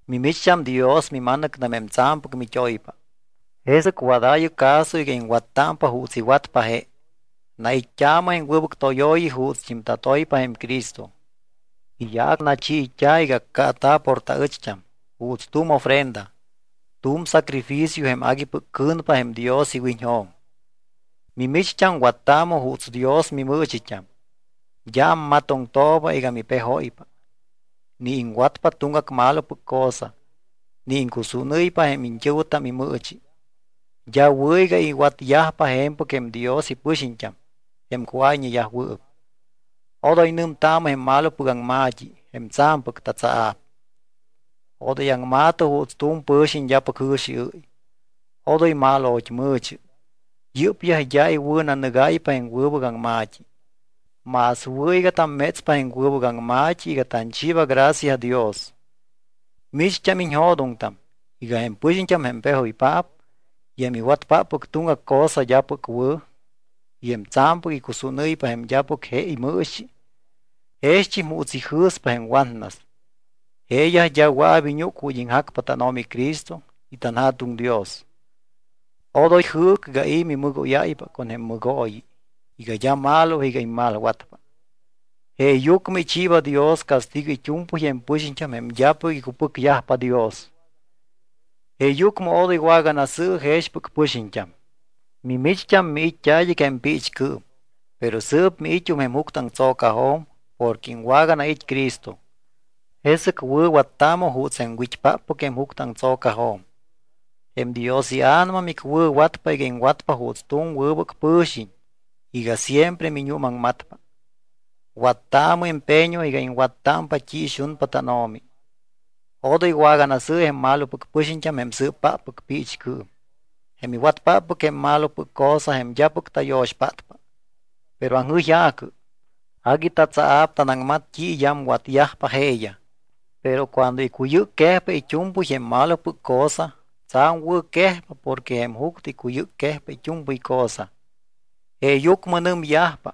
Mimicht́am Dios mima̱nɨctam jém tsa̱mpɨc mit́oypa. Jesɨc wadaayɨ caso iga iŋwattámpa juuts iwatpa je. Nait́t́aamɨ jém wɨbɨc tóyooyi juutst́im tatoypa jém Cristo. Iyaac nachiit́a̱ iga accaata̱ por taɨcht́am, juuts tu̱m ofrenda, tu̱m sacrificio jém aguipɨc cɨ̱npa jém Dios iwiñjo̱m. Mimicht́am wattaamɨ juuts Dios mimɨɨchit́am. D́a ammatoŋtooba iga mipejóypa, ni iŋwatpa tuŋgac malopɨc cosa, ni iŋcusúnɨ́ypa jém iñt́ɨ̱wɨtam imɨɨchi. D́a wɨ̱ iga iwatyajpa je̱mpɨc jém Dios ipɨxiñt́am, jém cuáyñeyajwɨɨp. Odoy nɨmtaamɨ jém malopɨc aŋma̱t́i, jém tsa̱mpɨc tatsaa̱p. Odoy aŋma̱tɨ juuts tu̱m pɨ̱xiñ d́apɨc jɨ̱xiɨ́y. Odoy mal o̱chmɨ̱chɨ. Yɨ́pyaj d́a iwɨ̱nanɨgáypa jém wɨbɨc aŋma̱t́i. Más wɨ̱ iga tammétspa jém wɨbɨc aŋma̱t́i iga tanchiiba gracia Dios. Micht́am iñjo̱doŋtam iga jém pɨxiñt́am jém pejoypaap, y jém iwatpáppɨc tuŋgac cosa d́apɨc wɨ̱, y jém tsa̱mpɨc icusúnɨ́ypa jém d́apɨc je imɨɨchi, jext́im juuts ijɨ̱spa jém watnas, jeeyaj d́a wɨa̱p iñúc ju̱t́ iŋjacpa tánO̱mi Cristo y tanJa̱tuŋ Dios. Odoy jɨɨcɨ iga i̱ mimɨgóyáypa con jém mɨgooyi iga d́a malo iga immalwatpa. Jeeyucmɨ ichiiba Dios castigo it́u̱mpɨy jém pɨxiñt́am jém d́apɨc icupɨcyajpa Dios. Jeeyucmɨ odoy waganasɨ̱ɨ jexpɨc pɨxiñt́am. Mimicht́am miit́t́a id́ɨc jém piichcɨɨm, pero sɨɨp miit́um jém juctɨaŋtso̱cajo̱m porque iŋwaganait́ Cristo. Jesɨc wɨ̱wattaamɨ juuts jém wit́páppɨc jém juctɨaŋtso̱cajo̱m. Jém Dios iA̱nama micwɨ̱watpa iga iŋwatpa juuts tu̱m wɨbɨc pɨ̱xiñ iga siempre miñuumaŋmatpa. Wattaamɨ empeño iga iŋwattámpa t́i ixunpa tánO̱mi. Odoy waganasɨ̱ɨ jém malopɨc pɨxiñt́am jém sɨɨpáppɨc piichcɨɨm, jém iwatpáppɨc jém malopɨc cosa jém d́apɨc tayo̱xpátpa, pero aŋjɨyja̱cɨ. Agui tatsaa̱p tanaŋmat t́i iyamwatyajpa jeeyaj. Pero cuando icuyɨcquejpa it́u̱mpɨy jém malopɨc cosa, tsa̱m wɨ̱ quejpa porque jém juctɨ icuyɨcquejpa it́u̱mpɨy cosa. Jeeyucmɨ nɨmyajpa: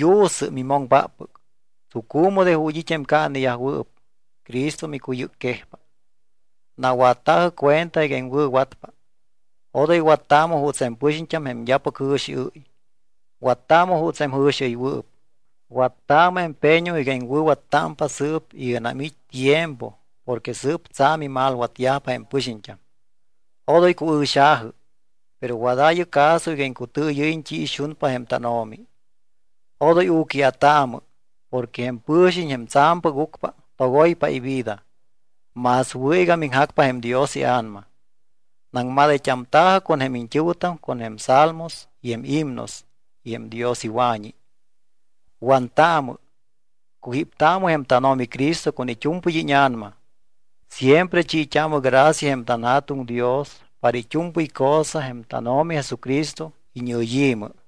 Yu̱sɨ, mimoŋpáppɨc. Tsucu̱mɨ de ju̱t́ it́ jém caaneyajwɨɨp, Cristo micuyɨcquejpa. Nawatta̱jɨ cuenta iga iŋwɨ̱watpa. Odoy wattaamɨ juuts jém pɨxiñt́am jém d́apɨc jɨ̱xiɨ́y. Wattaamɨ juuts jém jɨ̱xiɨywɨɨp. Wattaamɨ empeño iga iŋwɨ̱wattámpa sɨɨp iganam it́ tiempo porque sɨɨp tsa̱m imalwatyajpa jém pɨxiñt́am. Odoy cuɨ̱xa̱jɨ, pero wadaayɨ caso iga iŋcutɨɨyɨ́yiñ t́i ixunpa jém tánO̱mi. Odoy u̱quia̱taamɨ porque jém pɨ̱xiñ, jém tsa̱mpɨc ucpa, togoypa ivida. Más wɨ̱ iga miŋjacpa jém Dios iA̱nama. Naŋmadayt́amta̱jɨ con jém iñt́ɨ̱wɨtam con jém Salmos y jém himnos y jém Dios iwa̱ñi. Wantaamɨ, cujíptaamɨ jém tánO̱mi Cristo con it́u̱mpɨy íña̱nama. Siempre chiit́aamɨ gracia jém tanJa̱tuŋ Dios para it́u̱mpɨy cosa jém tánO̱mi Jesucristo iñɨyi̱mɨ.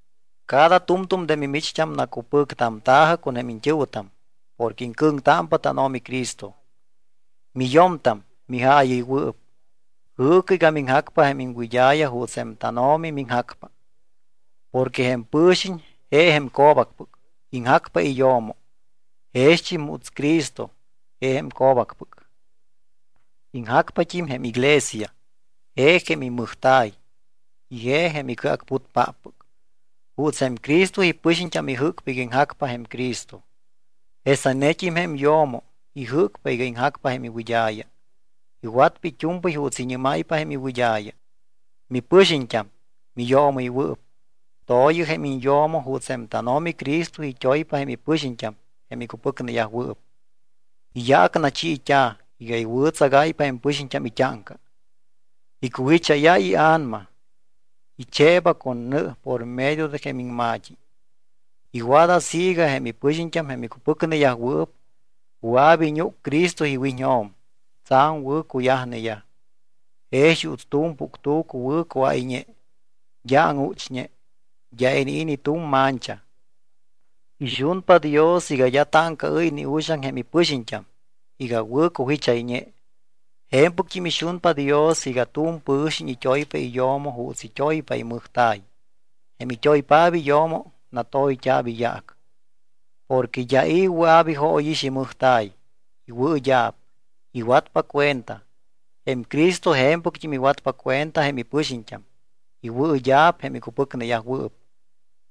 Cada tu̱mtu̱m de mimicht́am nacupɨctamta̱jɨ con jém iñt́ɨ̱wɨtam porque iŋcɨ̱ŋtámpa tánO̱mi Cristo. Miyo̱mtam, mijaayɨywɨɨp, jɨɨcɨ iga miŋjacpa jém iŋwɨd́a̱ya juuts jém tánO̱mi miŋjacpa. Porque jém pɨ̱xiñ je jém co̱bacpɨc, iŋjacpa iyo̱mo. Jext́im juuts Cristo, je jém co̱bacpɨc, iŋjacpat́im jém iglesia, je jém imɨjta̱y y je jém icɨacputpáppɨc. Juuts jém Cristo ipɨxiñt́am ijɨ́cpa iga iŋjacpa jém Cristo, jesanet́im jém yo̱mo ijɨ́cpa iga iŋjacpa jém iwɨd́a̱ya. Iwatpa it́u̱mpɨy juuts iñɨ́máypa jém iwɨd́a̱ya. Mipɨxiñt́am, miyoomɨywɨɨp, to̱yɨ jém iñyo̱mo juuts jém tánO̱mi Cristo it́oypa jém ipɨxiñt́am jém icupɨcneyajwɨɨp. Iyaac nachiit́a̱ iga iwɨ̱tsagáypa jém ipɨxiñt́am it́áŋca. Icujicháyáypa ia̱nama, icheeba con nɨ por medio de jém iŋma̱t́i. Iwat así iga jém ipɨxiñt́am, jém icupɨcneyajwɨɨp, wɨa̱p iñúc Cristo iwiñjo̱m tsa̱m wɨ̱cuyajneyaj. Jex juuts tu̱m puctu̱cu wɨ̱ cuáyñe, d́a áŋuchñe, d́a inii̱ ni tu̱m mancha. Ixunpa Dios iga d́a táŋcaɨ́y ni uxaŋ jém ipɨxiñt́am iga wɨ̱ cujichayñe. Je̱mpɨct́im ixunpa Dios iga tu̱m pɨ̱xiñ it́oypa iyo̱mo juuts it́oypa imɨjta̱y. Jém it́oypaap iyo̱mo, natoyt́a̱p iyaac. Porque d́a i̱ wɨa̱p ijóyix imɨjta̱y, iwɨɨd́a̱p, iwatpa cuenta. Jém Cristo je̱mpɨct́im iwatpa cuenta jém ipɨxiñt́am, iwɨɨd́a̱p jém icupɨcneyajwɨɨp,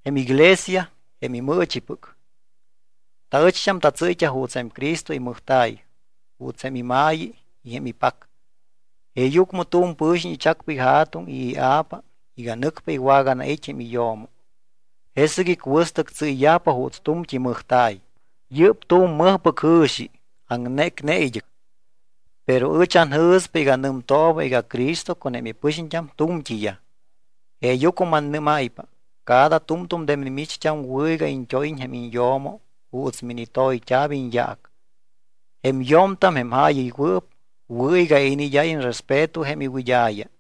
jém iglesia, jém imɨɨchipɨc. Taɨcht́am tatsɨ́yt́a juuts jém Cristo imɨjta̱y, juuts jém ima̱yi y jém ipac. “Jeeyucmɨ tu̱m pɨ̱xiñ ichacpa ija̱tuŋ y ia̱pa iga nɨcpa iwaganait́ jém iyo̱mo. Jesɨc icuɨstɨc tsɨ́yyajpa juuts tu̱mt́i mɨjta̱y.” Yɨ́p tu̱m mɨjpɨc jɨ̱xi, aŋnécne id́ɨc. Pero ɨch anjɨ̱spa iga nɨmtooba iga Cristo con jém ipɨxiñt́am tu̱mt́iyaj. Jeeyucmɨ mannɨ́máypa: Cada tu̱mtu̱m de mimicht́am wɨ̱ iga iñt́óyiñ jém iñyo̱mo juuts minitoyt́a̱p iñyaac. Jém yo̱mtam, jém jaayɨywɨɨp, wɨ̱ iga iniid́áyiñ respeto jém iwɨd́a̱ya.